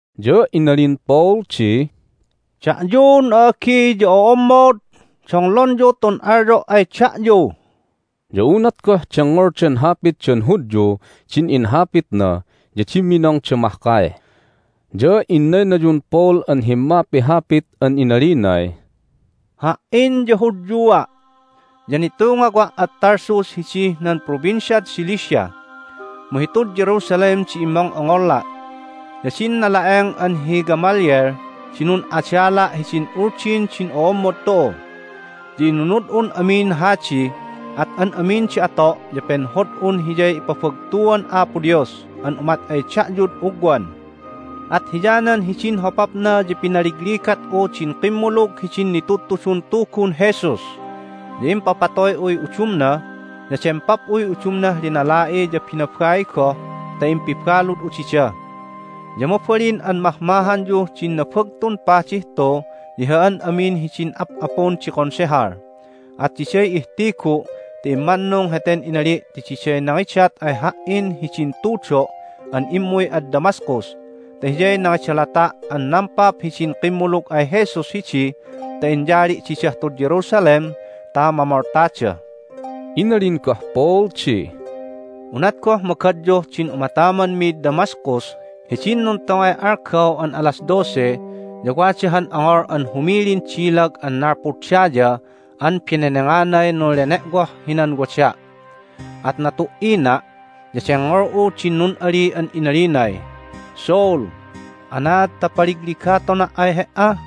Ya inalin Paul di, "Da'yun a'agi ya o'ommod, donglonyu tun alyo' ay da'yu!" Ya unat goh dengngoldan hapitdan Hudyu din inhapitna ya dimminongda mahkay. Ya innaynayun Paul an himmapihapit an inalinay, "Ha"in ya Hudyua', ya nitungawa' ad Tarsus hidih nan Provinciad Cilicia, mu hitud Jerusalem di immong'ongngola'. Ya din nala'eng an hi Gamaliel di nun'adala' hidin Uldin din o'ommod tu'u. Ya inunud'un amin hadi, at an amin di ato' ya penhod'un hiyay ipabagtuan Apo Dios an umat ay da'yud ugwan, at hiyanan hidin hopapna ya pinaligaligat'u din kimmulug hidin nitudtudun Tugun Jesus, ya impapatoy'uy udumna, ya dempap'uy udumnah linala'i ya binabai goh ta impibalud'u dida. Ya mabalin an mahmahanyuh din Nabagtun Padih tu ya hi an amin hidin ap'apun di Konsehal, at diday ihtigu' ti immannung heten inali' ti diday nangidat ay ha"in hidin tudo' an immuy ad Damascus ta hiyay nangidalata' an nampap hidin kimmulug ay Jesus hidi ta inyali' didah tud Jerusalem ta mamoltada." Inalin goh Paul di, "Unat goh magadyuh din umatamanmid Damascus hidin nuntongay algaw an alas dose ya wada han ongol an humilin dilag an nalpud daya an benenanganay nunlene'woh hinan wada'. At natu"ina', ya dengngol'u din nun'ali an inalinay, Saul! Anaad ta paligligatona' ay he"a?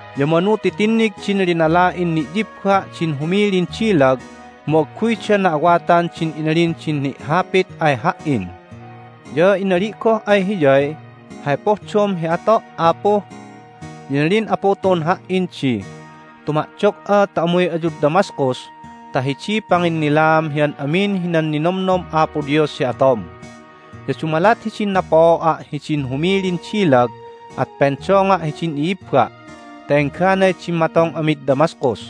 Ya manu ti tinnig din linala'in ni'yibba' din humilin dilag, mu agguyda na'awatan din inalin din ni'hapit ay ha"in. Ya inali' goh ay Hiyay, Hay pohdom hi ato', Apu? Ya inalin Apu tu'un ha"in di, Tuma'dog'a ta umuy ayud Damascus ta hidiy panginnilaam hi an amin hinan ninomnom Apo Dios hi atom. Ya dumalat din napooa' hidin humilin dilag at pendonga' hidin i'ibba' ta engganay dimmatong amid Damascus.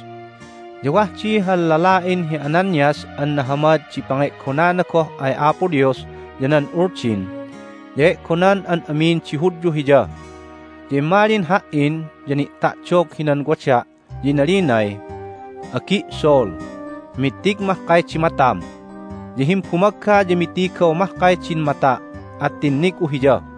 Ya wah di han lala'in hi Ananias an nahamad di pange'gonana goh ay Apo Dios ya nan Uldin, ya e'gonan an amin di Hudyu hiya. Ya immalin ha"in, ya ni'ta'dog hinan wada', ya inalinay, Agi' Saul, mittig mahkay di matam! Ya himbumagga ya mittigaw mahkay din mata', at tinnig'u hiya.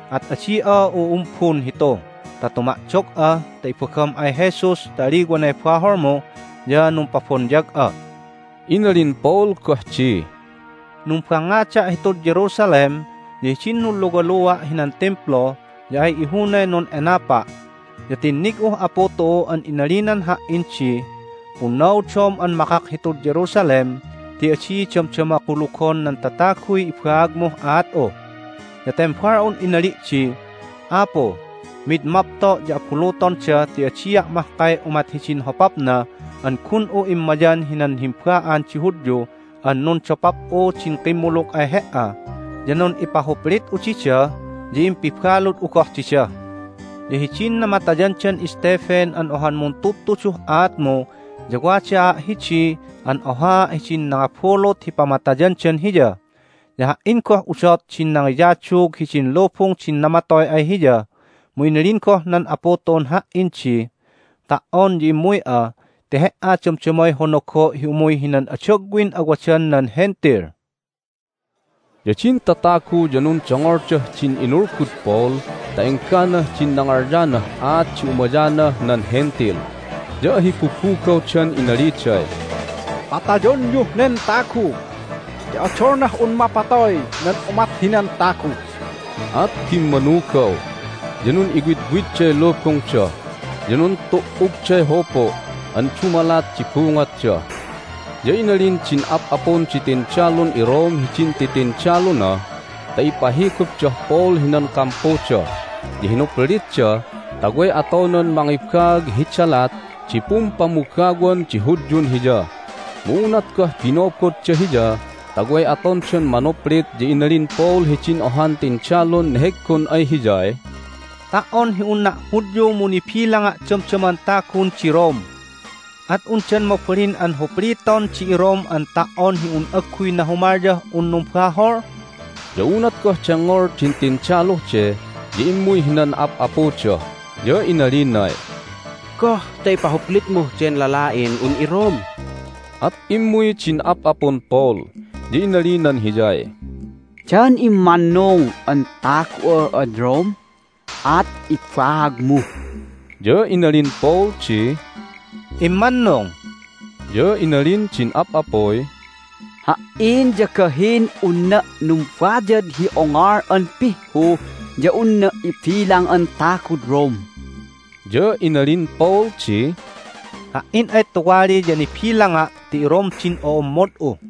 At adi'a u'umbun hitu ta tuma'dog'a ta ibagam ay Jesus ta aliwanay baholmu, ya numpabonyag'a." Inalin Paul goh di, "Numbangngada' hitud Jerusalem, ya hidin nunluwalua' hinan Timplu ya ay ihunay nun'enapa', ya tinnig'uh Apu tu'u an inalinan ha"in di, Punnaudom an makak hitud Jerusalem ti adi damdama kulugon nan tataguy ibaagmuh aat'u. Ya tembal'un inali' di, Apu, mid mapto' ya abulutonda ti adia' mahkay umat hidin hopapna an gun'u immayan hinan himba'an di Hudyu an nundopap'u din kimmulug ay He"a, ya nun'ipahuplit'u dida, ya impibalud'u goh dida. Ya hidin namatayandan Stephen an ohan muntudtuduh aatmu ya wadaa' hidi an ohaa' hidin nangabulut hi pamatayandan hiya, ya ha"in goh udot din nangiyadug hidin lubung din namatoy ay hiya! Mu inalin goh nan Apu tu'un ha"in di, Ta"on ya immuy'a ti he"a damdamay honogo' hi umuy hinan adagwin awadan nan Hentil." Ya din tatagu ya nundongoldah din inulgud Paul ta engganah din nangalyanah aat di umayanah nan Hentil, ya ahibubugawdan inaliday, "Patayonyuh nen tagu! Ti odolnah un mapatoy nan umat hinan tagu!" At bimmanugaw, ya nun'iwidwidday lubungda, ya nuntu"ugday hupu' an dumalat di bungotda. Ya inalin din ap'apun di tindalun iRome hidin titindaluna ta ipahigupdah Paul hinan kampuda, ya hinuplitda ta way atonan mangibaag hi dalat di pumpamugawan di Hudyun hiya. Mu unat goh binobodda hiya ta way atondan manuplit ya inalin Paul hidin ohan tindalun neheggon ay hiyay, "Ta"on hi unna' Hudyu mu nibilanga' damdaman tagun di Rome. At undan mabalin an hupliton di iRome an ta"on hi un agguy nahumalyah un numbahol?" Ya unat goh dengngol din tindaluh de ya immuy hinan ap'apuda, ya inalinay, "Goh ta ipahuplitmuh den lala'in un iRome?" At immuy din ap'apun Paul, ya inalinan hiyay, "Dan immannung an tagu'a ad Rome? At ibaagmu!" Ya inalin Paul di, "Immannung." Ya inalin din ap'apuy, "Ha"in ya gahin unna' numbayad hi ongol an pihhu ya unna' ibilang an tagud Rome." Ya inalin Paul di, "Ha"in ay tuwali ya nibilanga' ti iRome din o'ommod'u."